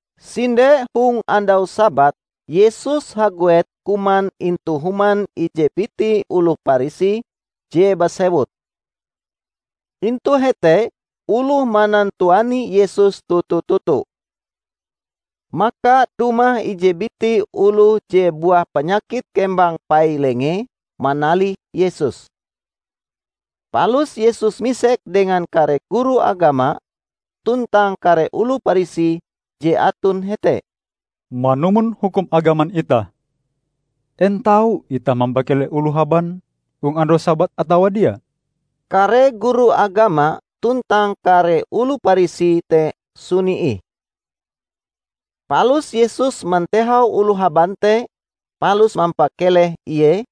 Sinde hong andau Sabat Yesus haguet kuman intu human ije biti oloh Parisi je basewut. Intu hete oloh manantuani Yesus toto-toto. Maka dumah ije biti oloh je buah panyakit kembang pai-lengee manalih Yesus. Palus Yesus misek dengan kare guru agama tuntang kare oloh Parisi je aton hete, "Manumon hukum agaman itah, en tau itah mampakeleh oloh haban hong andau Sabat atawa dia?" Kare guru agama tuntang kare oloh Parisi te suni ih. Palus Yesus mantehau oloh haban te palus mampakeleh ie,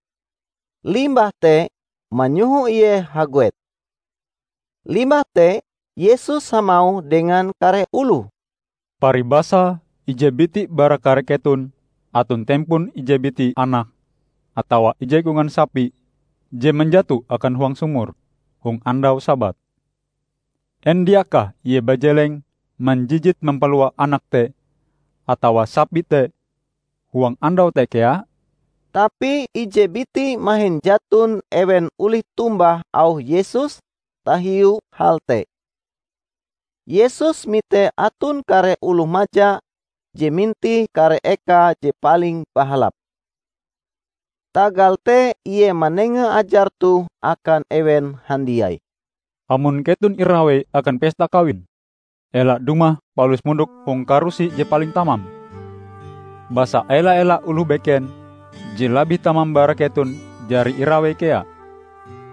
limbah te manyoho ie haguet. Limbah te Yesus hamauh dengan kare oloh, "Paribasae ije biti bara kare keton aton tempon ije biti anak atawa ije kongan sapi je manjato akan huang sumur hong andau Sabat, en diakah ie bajeleng manjijit mampalua anak te atawa sapi te huang andau te kea?" Tapi ije biti mahin jaton ewen olih tombah auh Yesus tahiu hal te. Yesus mite aton kare oloh maja je mintih kare eka je paling bahalap. Tagal te Ie manenga ajar toh akan ewen handiai. "Amon keton irawei akan pesta kawin, ela dumah palus mondok hong karusi je paling tamam. Basa ela-ela oloh beken je labih tamam bara keton jari irawei kea,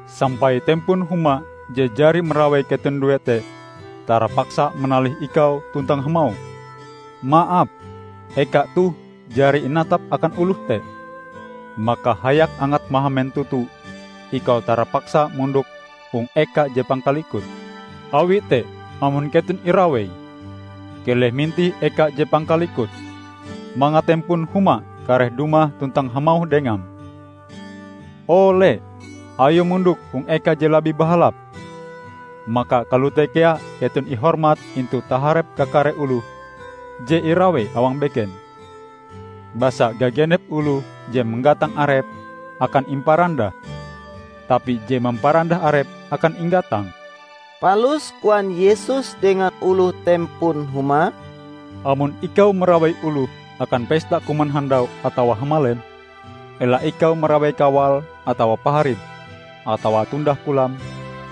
sampai tempon huma je jari marawei keton due te, tarapaksa manalih ikau tuntang hamauh, 'Maap, eka toh jari inatap akan oloh te.' Maka hayak angat mahamen toto ikau tarapaksa mondok hong eka je pangkalikute. Awi te amon keton irawei, keleh mintih eka je pangkalikute, mangat tempon huma kareh dumah tuntang hamauh dengam, 'O le, ayo mondok hong eka je labih bahalap.' Maka kalote kea keton ihormat intu taharep kakare oloh je irawei awang beken. Basa gagenep oloh je manggatang arepe akan imparandah, tapi je mamparandah arepe akan inggatang." Palus koan Yesus dengan oloh tempon huma, "Amon ikau marawei oloh akan pesta kuman handau atawa hamalem, ela ikau marawei kawalm atawa paharim, atawa tundah kolam,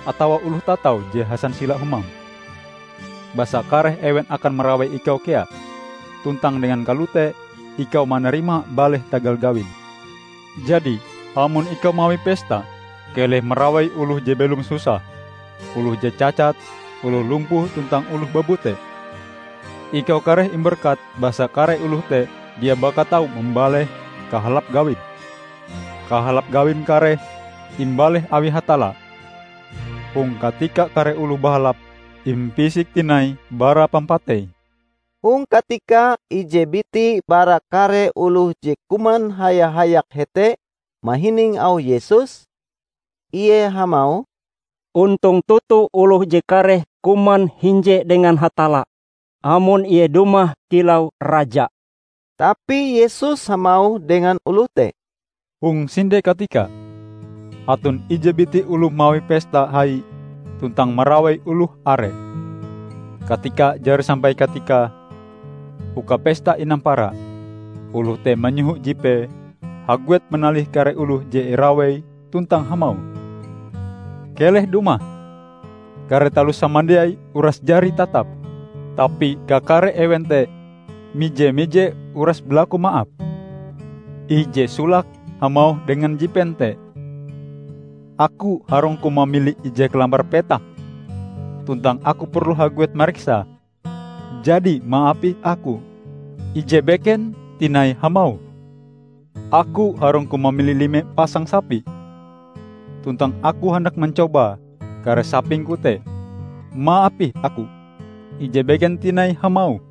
atawa oloh tatau je hasansila humam. Basa kareh ewen akan marawei ikau kea, tuntang dengan kalote ikau manarima baleh tagal gawim. Jadi amon ikau mawi pesta, keleh marawei oloh je belom susah, oloh je cacat, oloh lumpuh tuntang oloh babute. Ikau kareh imberkat basa kare oloh te dia baka tau mambaleh kahalap gawim. Kahalap gawim kareh imbaleh awi Hatalla hong katika kare oloh bahalap impisik tinai bara pampatei." Hong katika ije biti bara kare oloh je kuman haya-hayak hete mahining auh Yesus, ie hamauh, "Ontong toto oloh je kareh kuman hinje dengan Hatalla amon Ie dumah kilau Raja!" Tapi Yesus hamauh dengan oloh te, "Hong sinde katika, aton ije biti oloh mawi pesta hai tuntang marawei oloh are. Katika jari sampai katikae uka pesta inampara, oloh te manyoho jipee haguet manalih kare oloh je irawei tuntang hamauh, 'Keleh dumah, kare taloh samandiai uras jari tatap!' Tapi kakare ewen te mije-mije uras balaku maap. Ije solake hamauh dengan jipen te, 'Aku harungku mamili ije kalambar petak tuntang aku perlu haguet mariksae. Jadi maap ih aku' Ije beken tinai hamauh, 'Aku harungku mamili lime pasang sapi, tuntang aku handak mancoba kare sapingku te. Maap ih aku.' Ije beken tinai hamauh,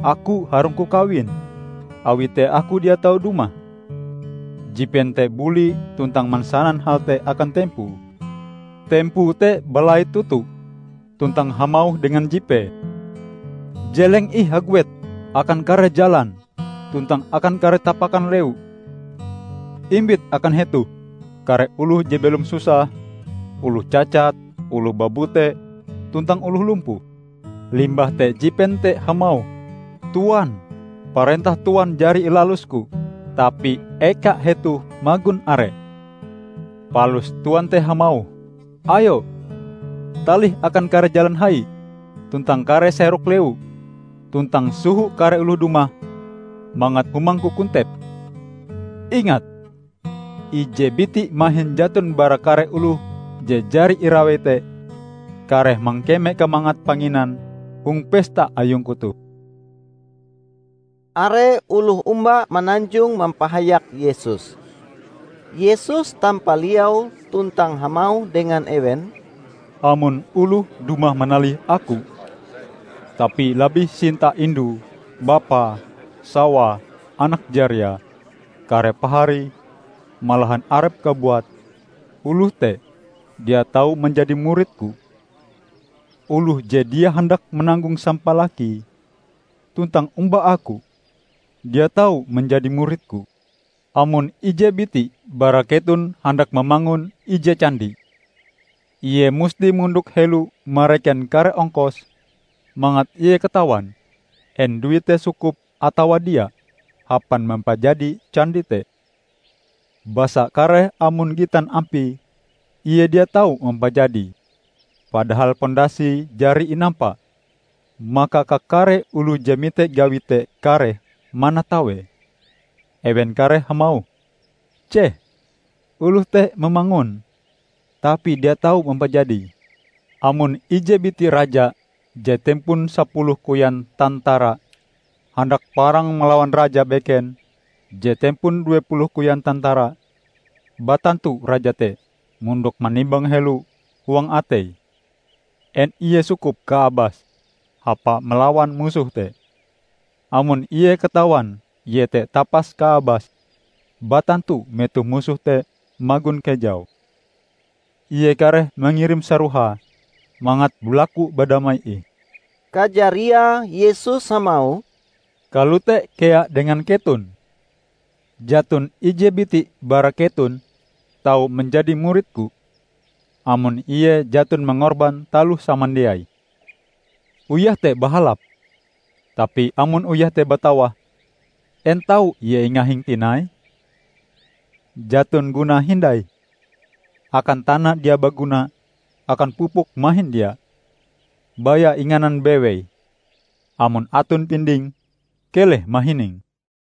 'Aku harungku kawin, awi te aku dia tau dumah.' Jipen te buli tuntang mansanan hal te akan tempoe. Tempoe te balait toto, tuntang hamauh dengan jipee, 'Jeleng ih haguet akan kare jalan tuntang akan kare tapakan lewu. Imbit akan hetoh kare oloh je belom susah, oloh cacat, oloh babute, tuntang oloh lumpuh.' Limbah te jipen te hamauh, 'Tuan, parentah Tuan jari ilalusku, tapi eka hetoh magon are.' Palus Tuan te hamauh, 'Ayo, talih akan kare jalan hai tuntang kare serok lewu, tuntang soho kare oloh dumah mangat humangku kontep. Ingat! Ije biti mahin jaton bara kare oloh je jari irawei te kareh mangkeme kamangat panginan hong pesta ayungku toh!' " Are oloh omba mananjong mampahayak Yesus. Yesus tampaliau tuntang hamauh dengan ewen, "Amon oloh dumah manalih Aku, tapi labih sinta indue, bapae, sawae, anak jariae, kare paharie, malahan arepe kabuat, oloh te dia tau manjadi murid-Ku. Oloh je dia handak mananggong sampalakie tuntang omba Aku, dia tau manjadi murid-Ku. Amon ije biti bara keton handak mamangun ije candi, ie musti mondok helo mareken kare ongkose mangat ie katawan en duite sukup atawa dia, hapan mampajadi candi te. Basa kareh amon gitan ampie ie dia tau mampajadie, padahal pondasie jari inampa, maka kakare oloh je mite gawi te kareh manatawee. Ewen kareh hamauh, 'Ceh, oloh te mamangun, tapi dia tau mampajadie!' Amon ije biti raja je tempon sapuluh koyan tantara handak parang malawan raja beken je tempon duepuluh koyan tantara, batantu raja te mondok manimbang helo huang ateie en ie sukup kaabase hapae malawan musohe te. Amon ie katawan ie te tapas kaabase, batantu metoh musohe te magon kejau, ie kareh mangirim sarohae mangat balaku badamai ih." Kajariae Yesus hamauh, "Kalote kea dengan keton. Jaton ije biti bara keton tau manjadi murid-Ku, amon ie jaton mangorban taloh samandiai." "Uyah te bahalap, tapi amon uyah te batawah, en tau ie ingahing tinai? Jaton gunae hindai, akan tana dia baguna akan pupuk mahin dia. Baya inganan bewei. Amon aton pinding keleh mahining!"